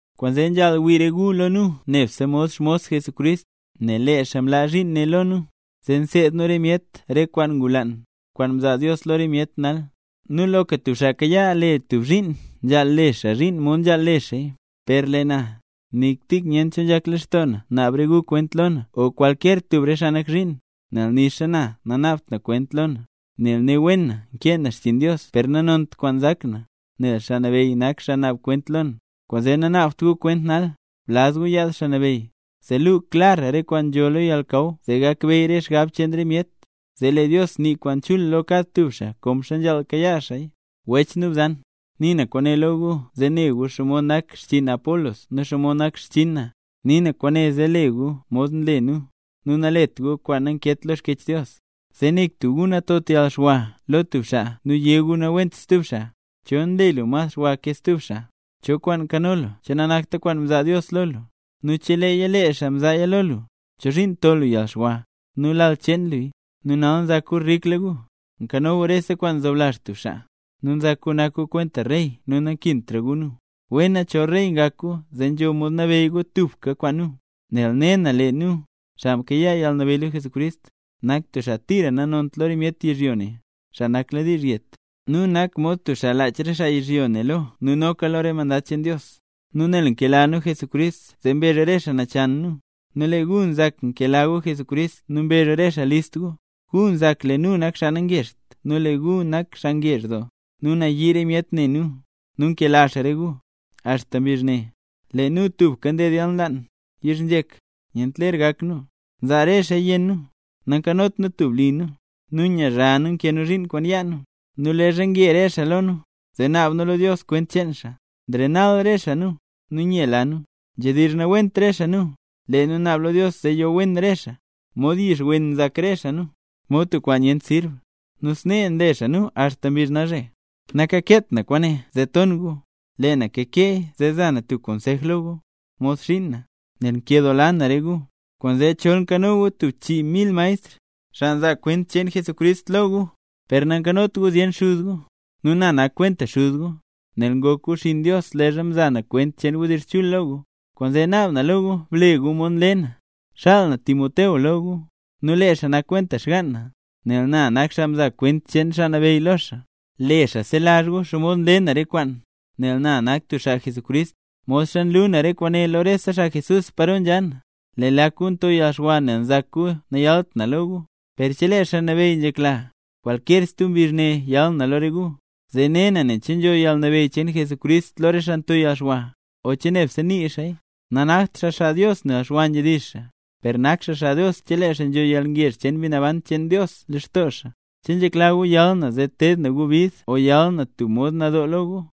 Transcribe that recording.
Kwaanzee nzhaal wii re gu lo nu nebse mod xmos Jesucrist, nel lee xaa mlaa zhiin ne lo nu, zee nseed nu re myet re kwaan ngulaan, kwaan mzaa Dios lo re myet nal. Nu loka tub xaa kayaa tub zhiin, nzhaal le xaa zhiin mod nzhaal le xaaya. Per lee na, nik tik nyent cho nzhak lextoo na, naab re gu kwent lo na o kwalkyer tub re xaa nak zhiin, nel nixa na nanaabt na kwent lo na. Nel ne na wen nkee na xchiin Dios per nanont kwaan nzak na, nel Xaa Nabeyy nak xaa naab kwent lo na. Kwaanzee nanaabt gu kwent nal, blaz gu yaad Xaa Nabeyy, zee luu xaa klar re kwaan nzho lo yalnakaw zee gakbeyy re xgab cheen re myet. Zee lee Dios nii kwaan chul lo kad tub xaa konxa nzhaal kayaa xaaya. Wech nu bzan, nii na kwaane lo gu zee ne gu xomod nak xchiin Apolos nu xomod nak xchinn na. Nii na kwaane zee le gu mod nle nu, nu nalet gu kwaan nankeet lo Xkyech Dios, zee nik tub gu natot yalxwa lo tub xaa nu yé gu nawent stub xaa. ¿Cho nle lu mas xwa ke stub xaa? ¿Cho kwaan nkano lu che nanakta kwaan mzaa Dios lo lu? Nu cheleeya lee xaa mzaaya lo lu, ¿chozhiin nto lu yalxwa nu lal cheen luya? Nu nal nzak gu rikla gu, nkano gu rese kwaan nzoblazh tub xaa, nu nzak gu nak gu kwenta rey nu nankintra gu nu. ¡Wena chol rey ngak gu zee nzho mod nabeyy gu tubka kwaan nu! Nel ne na lee nu, xaa mkayaa yalnabeyy lo Jesucrist, nak tub xaa tira nanont lo re myet yizhyo ne, xaa nakladiizh yet; nu nak mod tub xaa lach re xaa yizhyo ne lo nu noka re mandad cheen Dios. Nu nel nkela nu Jesucrist zee mbezh re xaa nachan nu, nu lee gu nzak nkela gu Jesucrist nu mbezh re xaa list gu. Gu nzak lee nu nak xaa nangezht nu lee gu nak xaa ngezh doo, nu nayii re myet ne nu, nu nkela re xaa gu. Axta mbizh ne, lee nu tubka nded yalnlaan, yizhnzhek, nyent ler gak nu, nzaa re xaaya yenn nu, nankanot nu tub li nu, nu nyazha nu nkee nu zhiin kwaan yaa nu. Nu leezha nge re xaa lo nu, zee naab nu lo Dios kwent cheen xaa; nrenal re xaa nu, nu nyela nu. Nzhedizh nawent re xaa nu, lee nu naab lo Dios zee yo wen re xaa. Mod yix wen re xaa, nu mod tub kwaan nyent sirb. Nu snee nle xaa nu axta mbizh nalzhe. Nakakeet na kwaane zee ton gu, lee na kakeeya zee za na tub konsej lo gu, mod xiin na, nel nkedoola na re gu. Kwaanzee chol nkano gu tub chii mil maestr, xaa nzaa kwent cheen Jesucrist lo gu, per nankanot gu zyen xuz gu. Nu na nak kwenta xuz gu, nel ngok gu xinn Dios leezha mza na kwent cheen wdizh chul lo gu. Kwaanzee naab na lo gu ble gu mod nle na. Xaal na Timoteo lo gu. Nu lee xaa nak kwenta xgaan na, nel na nak xaa mzaa kwent cheen Xaa Nabeyy lo xaa. Le xaa selazh gu xomod nle na re kwaan, nel na nak tub xaa Jesucrist, modxa nlu na re kwaane lo rese xaa Jesús paro nzha na. Lee lak gu nto yalxwa nel nzak gu nayalt na lo gu; per chelee Xaa Nabeyy nzhekla, kwalkyer stub mbizh ne yal na lo re gu. Zee ne na nen che nzho yalnabeyy cheen Jesucrist lo re xaa nto yalxwa, o che nebse nii xaaya. Nanakt xaa xaa Dios nel xwa nzhedizh xaa, per nak xaa xaa Dios cheleeya nzho yalngezh cheen Mbi Naban cheen Dios lextoo xaa. ¿Che nzhekla gu yal na zee teed na gu bid o yal na tub mod nadoo lo gu?